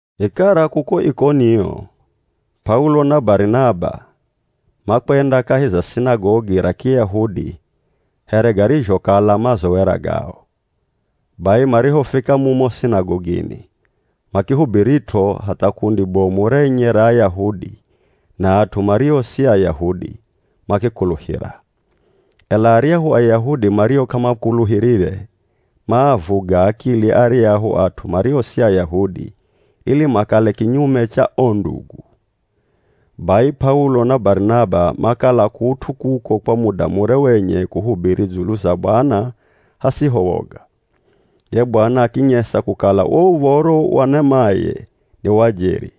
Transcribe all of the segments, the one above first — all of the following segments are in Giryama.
Vikara kuko Ikonio, P'aulo na Barinaba makwenda kahi za sinagogi ra Kiyahudi here garizhokala mazowera gao. Bai marihofika mumo sinagogini, makihubirit'o hatha kundi bomu renye ra Ayahudi na at'u mario si Ayahudi makikuluhira. Ela aryahu Ayahudi mario k'amakuluhirire, maavuga akili aryahu at'u mario si Ayahudi ili makale kinyume cha o ndugu. Bai P'aulo na Barinaba makala kut'u kuko kwa muda mure wenye kuhubiri dzulu za Bwana hasiho woga. Ye Bwana akinyesa kukala wo uv̱oro wa nemaye ni wa jeri,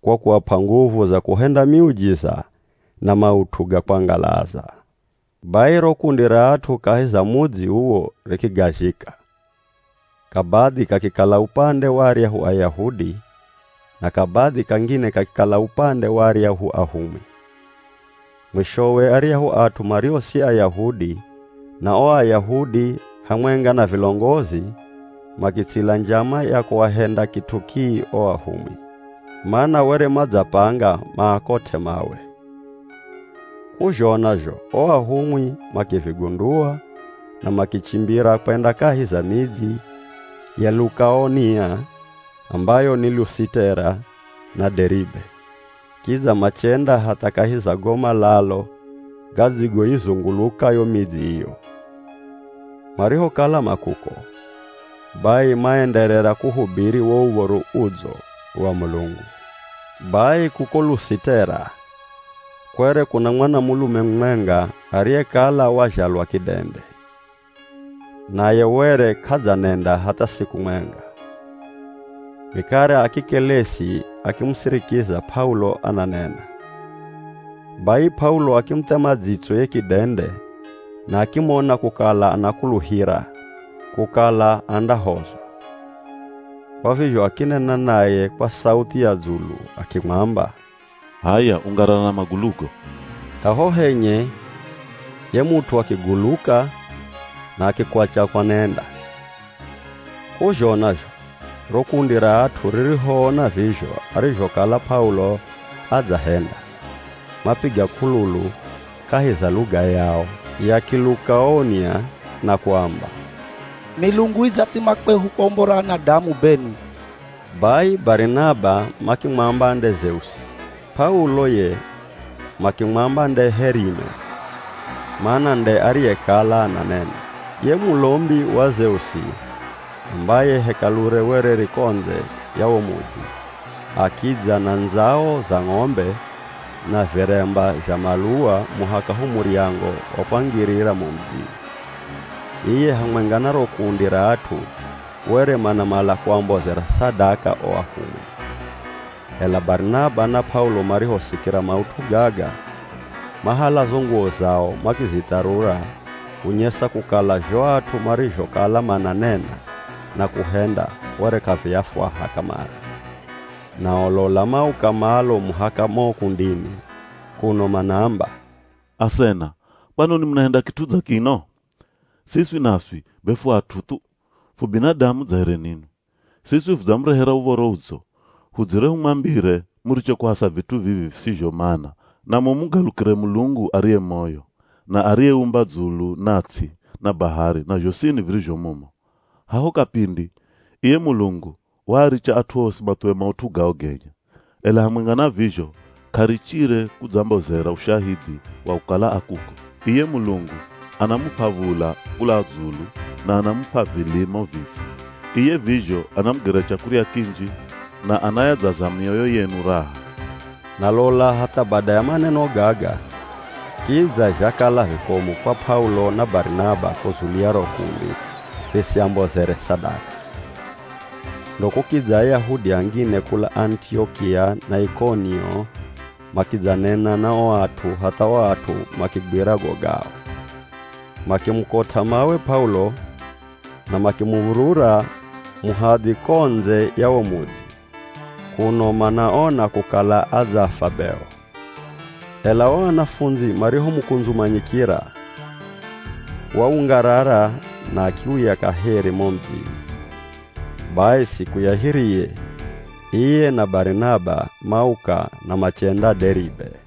kwa kuap'a nguvu za kuhenda miujiza na maut'u ga kwangalaza. Bai ro kundi ra at'u kahi za mudzi uwo rikigazhika, kabadhi kakikala upande wa aryahu Ayahudi, na kabadhi kangine kakikala upande wa aryahu ahumwi. Mwishowe aryahu at'u mario si Ayahudi na o Ayahudi hamwenga na vilongozi, makitsila njama ya kuahenda kit'u kii o ahumwi. Mana were madzapanga maakot'e mawe. K'uzhona zho o ahumwi makivigundua na makichimbira kwenda kahi za midzi ya Lukaonia ambayo ni Lusitera na Deribe, kidza machenda hatha kahi za go malalo gadzigoizunguluka yo midzi iyo. Marihokala ma kuko, bai maenderera kuhubiri wo Uv̱oro Udzo wa Mulungu. Bai kuko Lusitera kwere kuna mwanamulume mumwenga ariyekala wazhalwa kidende, naye were k'adzanenda hatha siku mwenga. Vikara akikelesi akimusirikiza P'aulo ananena. Bai P'aulo akimuthema dzitso ye kidende na akimona kukala anakuluhira kukala andahozwa, Kwa vizho akinena naye kwa sauthi ya dzulu akimwamba, “H'aya ungarara na magulugo!” Haho henye ye mut'u akiguluka na akikwatya kwanenda. K'uzhona zho, ro kundi ra at'u ririhoona vizho arizhokala P'aulo adzahenda, mapiga k'ululu kahi za luga yao ya Kilukaonia na kuamba, “Milungu idzathima kwehu kwa umbo ra anadamu benwi!” Bai Barinaba makimwamba nde Zeusi, P'aulo ye makimwamba nde Herime, mana nde ariyekala ananena. Ye mulombi wa Zeusi, ambaye hekalure were ri ko ndze ya wo mudzi, akidza na ndzao za ng'ombe na viremba zha maluwa muhaka ho muryango wa kwangirira mo mudzini. Iye hamwenga na ro kundi ra at'u were manamala kuambozera sadaka o ahumwi. Ela Barinaba na P'aulo marihosikira maut'u gaga, mahala zo nguwo zao makizitharura kunyesa kukala zho at'u marizhokala mananena na kuhenda were k'aviafwaha kamare. Nao lola mauka malo muhaka mo kundini kuno manaamba, “Asena, kwanoni munahenda kit'u dza kino? Siswi naswi be fu at'u thu, fu binadamu dza here ninwi. Siswi fudzamurehera Uv̱oro Udzo, hudzire humwambire muriche kuhasa vit'u vivi visizho mana na mumugalukire Mulungu ariye moyo, na ariyeumba dzulu na ts'i na bahari na zhosini virizho mumo. Haho kapindi, iye Mulungu, waaricha at'u osi mathuwe maut'u gao genye. Ela hamwenga na vizho k'arichire kudzambozera ushahidhi wa kukala a kuko. Iye Mulungu anamup'a v̱ula kula dzulu na anamup'a vilimo vidzo, iye vizho anamugera chakurya kinji na anayadzaza mioyo yenu raha.” Na lola hatha bada ya maneno gaga kidza zhakala vikomu kwa P'aulo na Barinaba kuzulia ro kundi risiambozere sadaka. Ndo kukidza Ayahudi angine kula Anitiokia na Ikonio, makidzanena na o at'u hatha o at'u makigwira go gao. Makimukot'a mawe P'aulo na makimuv̱urura muhadhi ko ndze ya wo mudzi, kuno manaona kukala adzafwa beo. Ela o anafundzi marihomukundzumanyikira, waungarara na akiuya kaheri mo mudzini. Bai siku ya hiriye, iye na Barinaba mauka na machenda Deribe.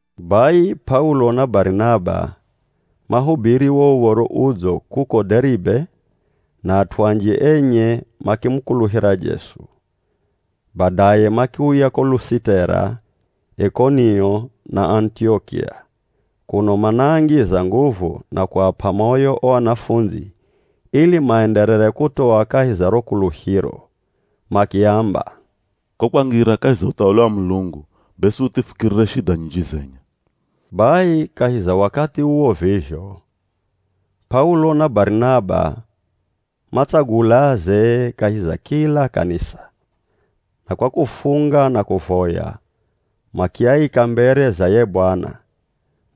Bai P'aulo na Barinaba mahubiri wo Uv̱oro Udzo kuko Deribe na at'u anji enye makimukuluhira Jesu. Badaye makiuya ko Lusitera, Ikonio na Anitiokia, kuno manaangiza nguvu na kuap'a moyo o anafundzi ili maenderere kutoa kahi za ro kuluhiro. Makiamba, “Ko kwangira kahi za uthawali wa Mulungu, be suthi fukirire shidha nyinji zenye.” Bai kahi za wakathi uwo vizho, P'aulo na Barinaba matsagula azee kahi za kila kanisa, na kwa kufunga na kuvoya, makiaika mbere za ye Bwana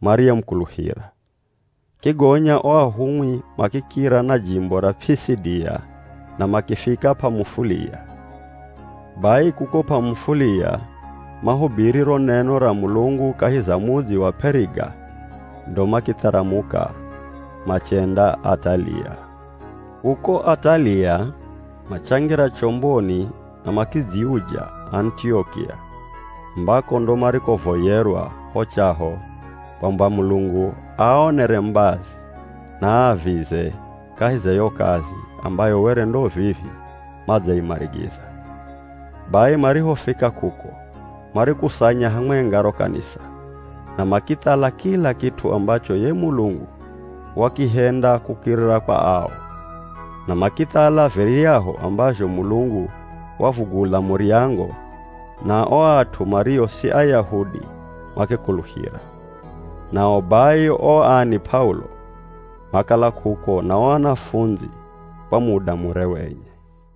mariyemukuluhira. Kigonya o ahumwi makikira na jimbo ra P'isidia na makifika P'amufulia. Bai kuko P'amufulia mahubiri ro neno ra Mulungu kahi za mudzi wa P'eriga ndo makitharamuka machenda Atalia. Kuko Atalia machangira chomboni na makidziuja Anitiokia ambako ndo marikovoyerwa ho chaho kwamba Mulungu aaonere mbazi na aavize kahi za yo kazi ambayo were ndo vivi madzaimarigiza. Bai marihofika kuko, marikusanya hamwenga ro kanisa na makithala kila kit'u ambacho ye Mulungu wakihenda kukirira kwa ao, na makithala viryahu ambazho Mulungu wavugula muryango na o at'u mario si Ayahudi makikuluhira. Nao bai o ani P'aulo makala kuko na o anafundzi kwa muda mure wenye.